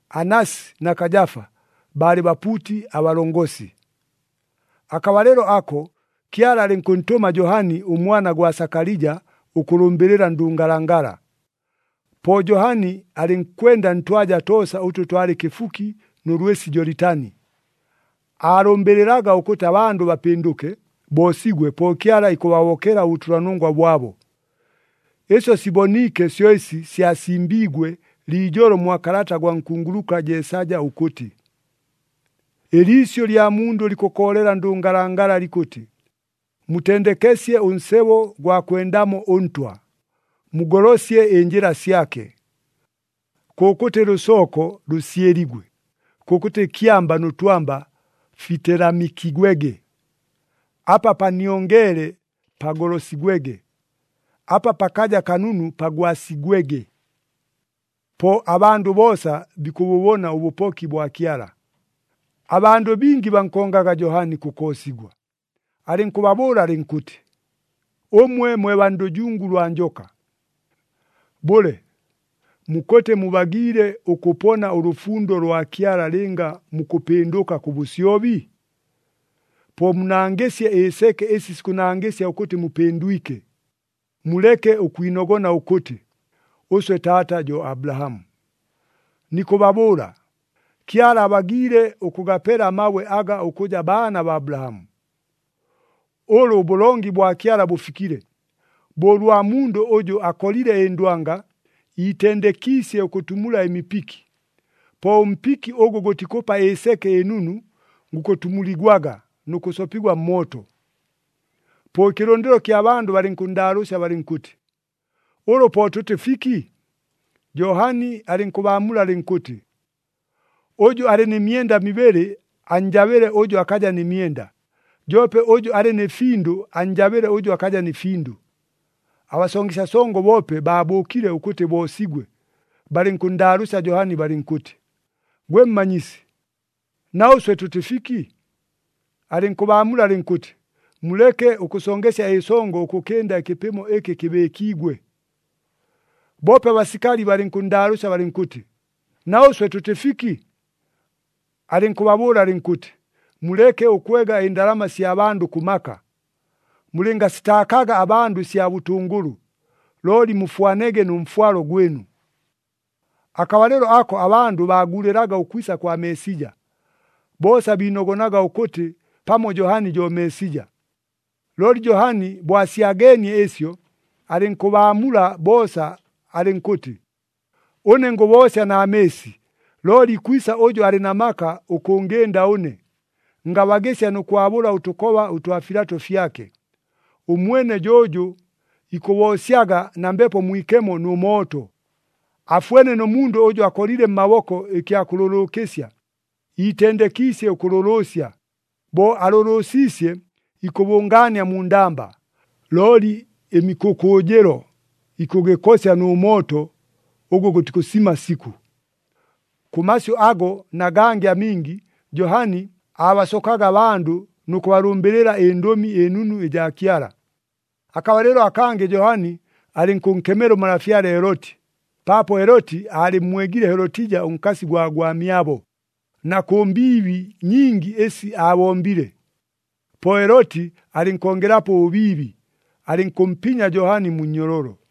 Anasi na Kajafa baalɨ bapuuti abalongosi. Akabalɨlo ako, Kyala alɨnkʉntʉma Johani ʉmwana gwa Sakalija ʉkʉlʉmbɨlɨla ndʉngalangala. Po Johani alɨnkwenda ntwaja toosa ʉtʉ twalɨ kɨfuki nʉ lwɨsi Jolitani. Aalʉmbɨlɨlaga ʉkʉtɨ abandʉ bapɨndʉke, boosigwe, po Kyala ikʉbahobokela ʉbʉtʉlanongwa bwabo. Ɨsyo siboniike syo ɨsi syasimbiigwe liijolo mwa kalata gwa nkunguluka Jeesaja ʉkʉtɨ, “Ɨliisyʉ lya mundʉ likʉkoolela ndʉngalangala likʉtɨ, ‘Mutendekesye ʉnsebo ʉgwa kwendamo ʉNtwa! Mugolosye ɨnjɨla syake! Kʉkʉtɨ lʉsooko lʉsyɨligwe, kʉkʉtɨ kyamba nʉ twamba fitelamikigwege. Apa paniongeele pagolosigwege, apa pakaja kanunu pagwasigwege. Po abandʉ boosa bikʉbʉbona ʉbʉpoki bwa Kyala.’” Abandʉ bingi bankongaga Johani kʉkoosigwa. Alɨnkʉbabʉʉla alɨnkʉtɨ, “Ʉmwe mwe baa ndʉjungu lwa njoka! Bʉle, mukʉtɨ mubagiile ʉkʉpona ʉlʉfundo lwa Kyala lɨnga mukʉpɨndʉka kʉ bʉsyobi? Po munangɨsye ɨseke ɨsi sikʉnangɨsya ʉkʉtɨ mupɨndwike. Muleke ʉkwinogona ʉkʉtɨ, ‘Ʉswe taata jo Abulahamu.’ Nikʉbabʉʉla, Kyala abagiile ʉkʉgapela amabwe aga ʉkʉja baana baa Abulahamu! Ʉlʉ ʉbʉlongi bwa Kyala bʉfikile, bo ʉlwa mundʉ ʉjʉ akolile ɨndwanga, iitendekiisye ʉkʉtumula ɨmipiki. Po ʉmpiki ʉgʉ gʉtikʉpa ɨseke ɨnunu, gukʉtumuligwaga nʉ kʉsopigwa mmooto.” Po ɨkɨlʉndɨlo kya bandʉ balɨnkʉnndaalʉʉsya balɨnkʉtɨ, “Ʉlʉ po tʉtɨ fiki?” Johani alɨnkʉbaamula alɨnkʉtɨ, “Ʉjʉ alɨ nɨ myenda mibɨlɨ annjabɨle ʉjʉ akaja nɨ myenda, joope ʉjʉ alɨ nɨ findʉ annjabɨle ʉjʉ akaja nɨ findʉ.” Abasongesya songo boope baabʉʉkile ʉkʉtɨ boosigwe, balɨnkʉnndaalʉʉsya Johani balɨnkʉtɨ, “Gwe Mmanyisi, na ʉswe tʉtɨ fiki?” Alɨnkʉbaamula alɨnkʉtɨ, “Muleke ʉkʉsongesya ɨsongo ʉkʉkɨnda ɨkɨpɨmo ɨkɨ kɨbɨɨkiigwe.” Boope abasikali balɨnkʉnndaalʉʉsya balɨnkʉtɨ, “Na ʉswe tʉtɨ fiki?” Alɨnkʉbabʉʉla alɨnkʉtɨ, “Muleke ʉkwega ɨndalama sya bandʉ kʉ maka, mulɨngasitaakaga abandʉ ɨsya bʉtʉngʉlʉ, looli mufwanege nʉ mfwalo gwɨnu.” Akabalɨlo ako abandʉ baaguulɨlaga ʉkwisa kwa Meesija, boosa biinogonaga ʉkʉtɨ pamo Johani jo Meesija. Looli Johani bo asyageenie ɨsyo, alɨnkʉbaamula boosa alɨnkʉtɨ, “Ʉne ngʉboosya na mɨɨsi, looli ikwisa ʉjʉ alɨ na maka ʉkʉngɨnda ʉne, ngabagɨsya nʉ kwabʉla ʉtʉkoba ʉtwa filato fyake. Ʉmwene jo ʉjʉ ikʉboosyaga na Mbepo Mwikemo nʉ mooto. Afwene nʉ mundʉ ʉjʉ akolile mmaboko ɨkya kʉlʉlʉʉkɨsya, iitendekiisye ʉkʉlʉlʉʉsya. Bo alʉlʉʉsiisye, ikʉbʉngaania mu ndamba, looli ɨmikʉkʉʉjɨlo ikʉgɨkosya nʉ mooto ʉgʉ gʉtikʉsima sikʉ.” Kʉ masyʉ ago na gangɨ amingi, Johani aabasokaga abandʉ nʉ kʉbalʉmbɨlɨla ɨNdʉmi ɨNunu ɨjaa Kyala. Akabalɨlo akangɨ Johani alɨnkʉnkemela ʉmalafyale Heloti, paapo Heloti aalɨmmwegile Helotija ʉnkasi gwa gwamyabo, na kʉ mbiibi nyingi ɨsi aabombile. Po Heloti alɨnkongelapo ʉbʉbiibi, alɨnkʉmpinya Johani mu nnyololo.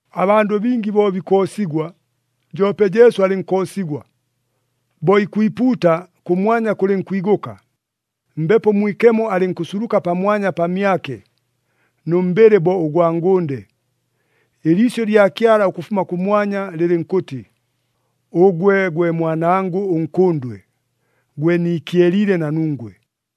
Abandʉ bingi bo bikoosigwa, joope Jesu alɨnkoosigwa. Bo ikwipuuta, kʉmwanya kʉlɨnkwigʉka, Mbepo Mwikemo alɨnkʉsuluka pamwanya pamyake, nʉ mbɨlɨ bo ʉgwa ngʉnde. Ɨliisyʉ lya Kyala ʉkʉfuma kʉmwanya, lɨlɨnkʉtɨ, “Ʉgwe gwe Mwanangʉ ʉNkʉndwe, gwe niikyeliile na nungwe.”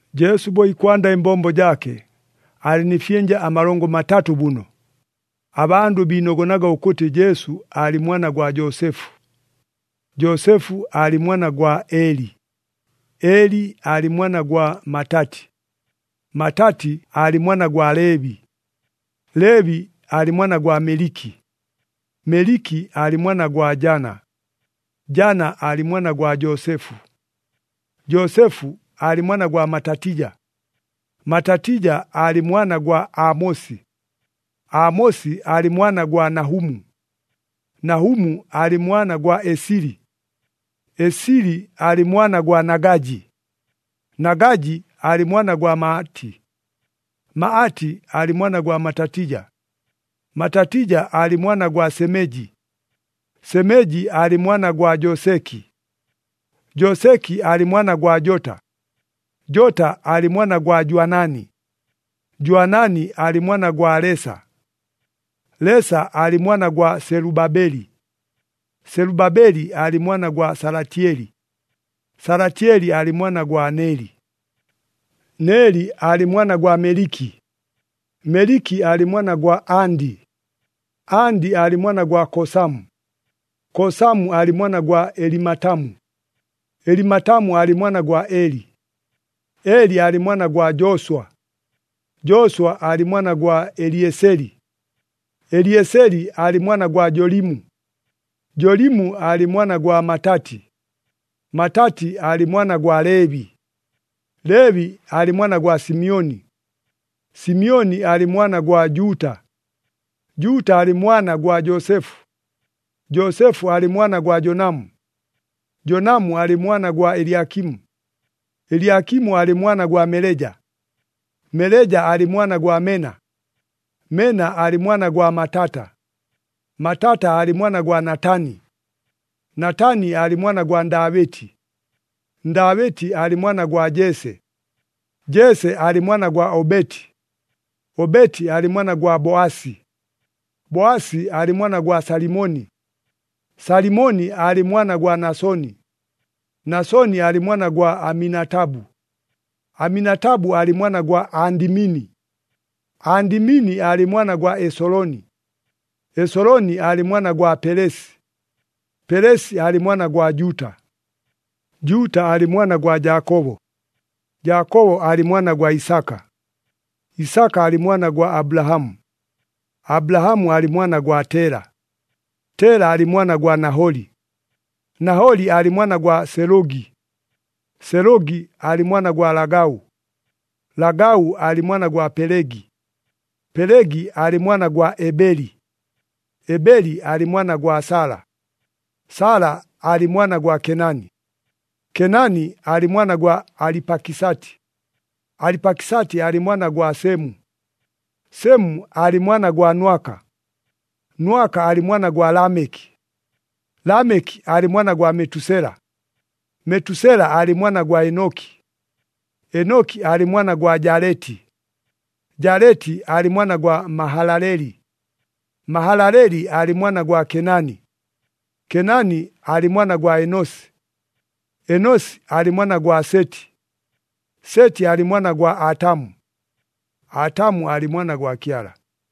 Jesu bo ikwanda ɨmbombo jaake, aalɨ nɨ fyɨnja amalongo matatʉ bʉno. Abandʉ biinogonaga ʉkʉtɨ Jesu aalɨ mwana gwa Joosefu, Joosefu aalɨ mwana gwa Eli, Eli aalɨ mwana gwa Matati, Matati aalɨ mwana gwa Leebi, Leebi aalɨ mwana gwa Meliki, Meliki aalɨ mwana gwa Jana, Jana aalɨ mwana gwa Joosefu, Joosefu aalɨ mwana gwa Matatija, Matatija aalɨ mwana gwa Aamosi, Aamosi aalɨ mwana gwa Nahumu, Nahumu aalɨ mwana gwa Esili, Esili aalɨ mwana gwa Nagaji, Nagaji aalɨ mwana gwa Maati, Maati aalɨ mwana gwa Matatija, Matatija aalɨ mwana gwa Semeji, Semeji aalɨ mwana gwa Joseki, Joseki aalɨ mwana gwa Jota, Jota aalɨ mwana gwa Jwanani, Jwanani aalɨ mwana gwa Lesa, Lesa aalɨ mwana gwa Selubabeli, Selubabeli aalɨ mwana gwa Salatyeli, Salatyeli aalɨ mwana gwa Neli, Neli aalɨ mwana gwa Meliki, Meliki aalɨ mwana gwa Andi, Andi aalɨ mwana gwa Kosamu, Kosamu aalɨ mwana gwa Elimatamu, Elimatamu aalɨ mwana gwa Eli, Eli aalɨ mwana gwa Jooswa, Jooswa aalɨ mwana gwa Elieseli, Elieseli aalɨ mwana gwa Jolimu, Jolimu aalɨ mwana gwa Matati, Matati aalɨ mwana gwa Leebi, Leebi aalɨ mwana gwa Simyoni, Simyoni aalɨ mwana gwa Juuta, Juuta aalɨ mwana gwa Joosefu, Joosefu aalɨ mwana gwa Jonamu, Jonamu aalɨ mwana gwa Elyakimu, Elyakimu aalɨ mwana gwa Meleja, Meleja aalɨ mwana gwa Mena, Mena aalɨ mwana gwa Matata, Matata aalɨ mwana gwa Natani, Natani aalɨ mwana gwa Ndaabɨti, Ndaabɨti aalɨ mwana gwa Jese, Jese aalɨ mwana gwa Obeti, Obeti aalɨ mwana gwa Boasi, Boasi aalɨ mwana gwa Salimoni, Salimoni aalɨ mwana gwa Nasoni, Nasoni aalɨ mwana gwa Aminatabu, Aminatabu aalɨ mwana gwa Andimini, Andimini aalɨ mwana gwa Esoloni, Esoloni aalɨ mwana gwa Pelesi, Pelesi aalɨ mwana gwa Juuta, Juuta aalɨ mwana gwa Jaakobo, Jaakobo aalɨ mwana gwa Isaka, Isaka aalɨ mwana gwa Abulahamu, Abulahamu aalɨ mwana gwa Tela, Tela aalɨ mwana gwa Naholi, Naholi aalɨ mwana gwa Selʉgi, Selʉgi aalɨ mwana gwa Lagau, Lagau aalɨ mwana gwa Pelegi, Pelegi aalɨ mwana gwa Ebeli, Ebeli aalɨ mwana gwa Sala, Sala aalɨ mwana gwa Kenani, Kenani aalɨ mwana gwa Alipakisati, Alipakisati aalɨ mwana gwa Semu, Semu aalɨ mwana gwa Nwaka, Nwaka aalɨ mwana gwa Lameki, Lameki aalɨ mwana gwa Metusela, Metusela aalɨ mwana gwa Enoki, Enoki aalɨ mwana gwa Jaleti, Jaleti aalɨ mwana gwa Mahalaleli, Mahalaleli aalɨ mwana gwa Kenani, Kenani aalɨ mwana gwa Enosi, Enosi aalɨ mwana gwa Seti, Seti aalɨ mwana gwa Atamu, Atamu aalɨ mwana gwa Kyala.